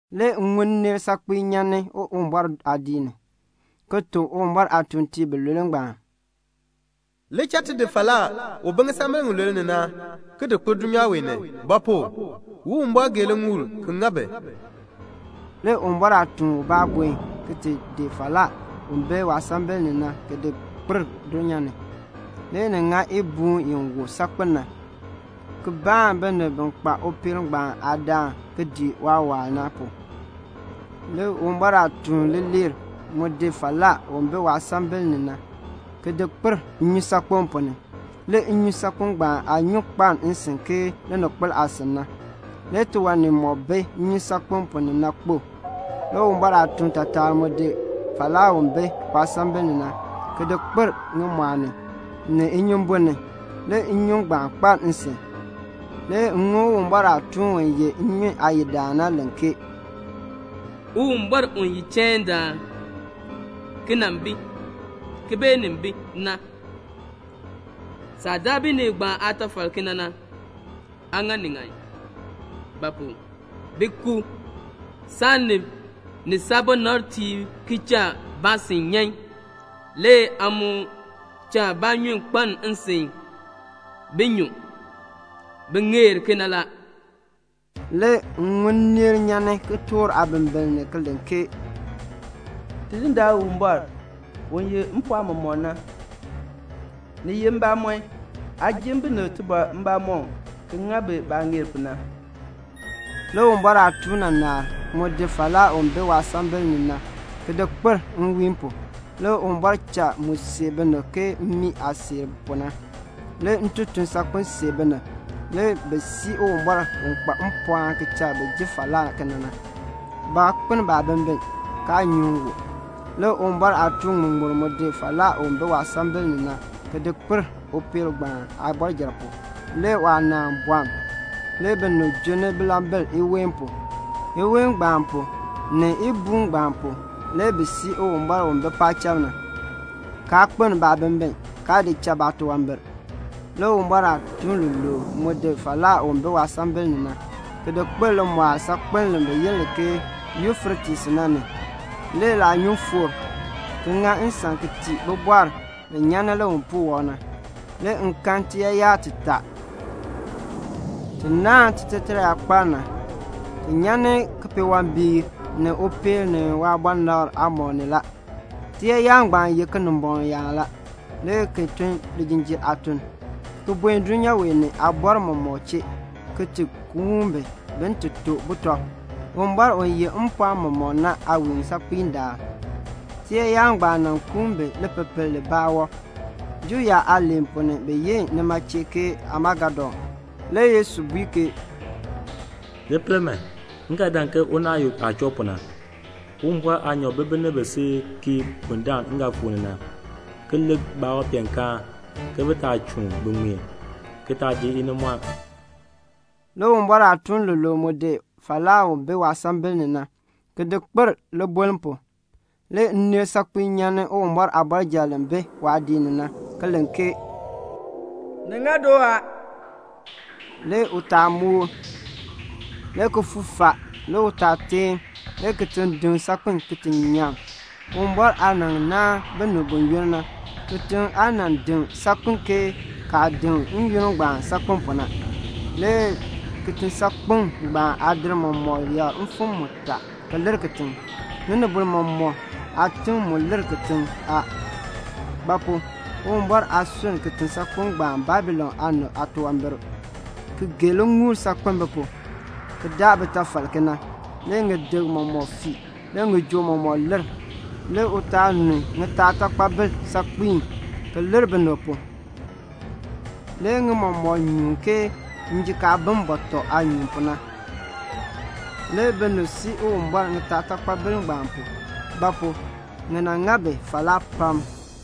Le m ŋun nneel saakpiin nyan Uwumbɔr aadiik ni, ki tuk Uwumbɔr aatuuntiib bilule ngbaan, "Li cha ti di falaa u bi ŋisambil ŋilule ni na, ki di kpir dulnyaa ni; ba pu? Uwumbɔr gee liŋuul ki ŋa bi." Le Uwumbɔr aatuun ubaa buen ki di falaa u bi waasambil ni na ki di kpir dulnyaa ni. Le ni ŋa ibuun i wu saakpen na ki baan binib bi kpa upeel ngbaan aadaan ki dii waawaal na pu. Le Uwumbɔr aatuun leeler mu di falaa u bi waasambil ni na, ki di kpir nnyusaakpem ponn ni. Le nnyusaakpem ngbaan aanyun kpaln nsin ke lininkpol aasin na. Le tiwan nimɔk bi nnyusaakpem ponn ni na kpo a. Le Uwumbɔr aatuun taatar mu di falaa u bi waasambil ni na, ki di kpir ŋimɔɔ ni, ni inyumbun ni. Le nnyun ngbaan kpaln nsin. Le m ŋun Uwumbɔr aatuun u ye nnyun aayidaan na len ke "Uwumbɔr u ye chaindaan, ki nan bi, ki beenin bi na, saah daa binib ngbaan aatafal kena na, aa ŋa ni ŋan; ba pu? bi ku saanib ni saabɔnabtiib ki cha baasin nyan, le aa mu cha baanyun kpaln nsin bin nyu. Bi ŋeer kena la." Le m ŋun nneel nyan kitork aabimbiln ni ki len ke "Tidindaan Uwumbɔr, u yeh mpɔɔn mɔmɔk na, ni ye mbamɔn, aa ji binib tibɔr mbamɔm ki ŋa bi baah ŋeer pu na." Le Uwumbɔr aatuun naanar mu di falaa u bi waasambil ni na, ki di kpir nwiin pu. Le Uwumbɔr cha mu seer binib ke mmii aah seer pu na. Le ntoton saakpen seer binib. Le bi sii Uwumbɔr u kpa mpɔɔn ki cha bi ji falaa kena na. Baa kpeln baabimbin, kaa nyuŋ u. Le Uwumbɔr aatuun ŋmuŋmur mu di falaa u bi waasambil ni na ki di kpir upeel ngbaan aabɔrjal pu. Le waanaan bɔln. Le binib junni bilambil iween pu. Iween ngbaan pu ni ibuun ngbaan pu le bi sii Uwumbɔr u bi paacham na, kaa kpeln baabimbin, kaa di cha baatunwambir. Le Uwumbɔr aatuun luluub mu di falaa u bi waasambil ni na, ki di kpir limɔɔl saakpeln bi yi li ke Yufretes na ni. Le laanyun foor a, ki ŋa nsan ki tii bibɔrb bi nyan ni liwipuul wɔb na. Le m kan tiyaayar titaa, ti naahn titaateeraakpaln na. Ti nyan ni kipeewambiik, ni upeel, ni waabɔnabr aamɔb ni la. Tiyaayar ngbaan ye Kinimbɔŋ yaan, le ki tun lijinjiir aatun, ki buen dulnyaa wee ni aabɔrb mɔmɔk chee, ki ti kuun bi, bin ti to butɔb, Uwumbɔr u yeh mpɔɔn mɔmɔk na aawiinsaakpiin daal. Tiyaayar ngbaan kuun bi lipepel libaa wɔb. Juu yaab aaliin ponn ni bi yi nima chee ke Amagedon. Le Yesu bui ke "Li pel man, m ga dan ke unaayuk aah choo pu na. Uwumbɔr aanyoor bi binib bi si kii bundaln m ga fuu ni na, ki lik baawanpeenkaan ke bi taa chuun bi ŋmeen, ki taa ji inimɔɔn." Le Uwumbɔr aatuun lulule mu di falaa u bi waasambil ni na, ki di kpir libuln pu. Le nneel saakpiin nyan ni Uwumbɔr aabɔrjal li bi waadiik ni na, ki len, "Ni ŋa doo a." Le utaal moor, le kifuuk faa, le utaal teen, le kitiŋ deŋ saakpen ki ti nyaŋ. Uwumbɔr aah nan naan binib buyoonn na, kitiŋ aa nan deŋ saakpen ke kaah deŋ n-yoonn ngbaan saakpen pu na. Le kitisaakpeŋ ngbaan aadir mɔmɔk yakr mfim mutaa ki lir kitiŋ. Ŋinibol mɔmɔk aatim mu lir kitiŋ a; ba pu? Uwumbɔr aa sunn kitisaakpeŋ ngbaan Babilon aanib aatunwambir, ki gee liŋuul saakpen bi pu, ki daa bitafal kena. Le ŋiyik mɔmɔk fii, le ŋijoo mɔmɔk lir. Le utaal nu ŋitaatakpabil saakpiin, ki lir binib pu. Le ŋi mɔmɔk nyuun ke bɔtɔ mam aah nyuun pu na. Le binib sii Uwumbɔr ŋitaatakpabil ngbaan pu; ba pu? ŋi ŋa bi falaa pam.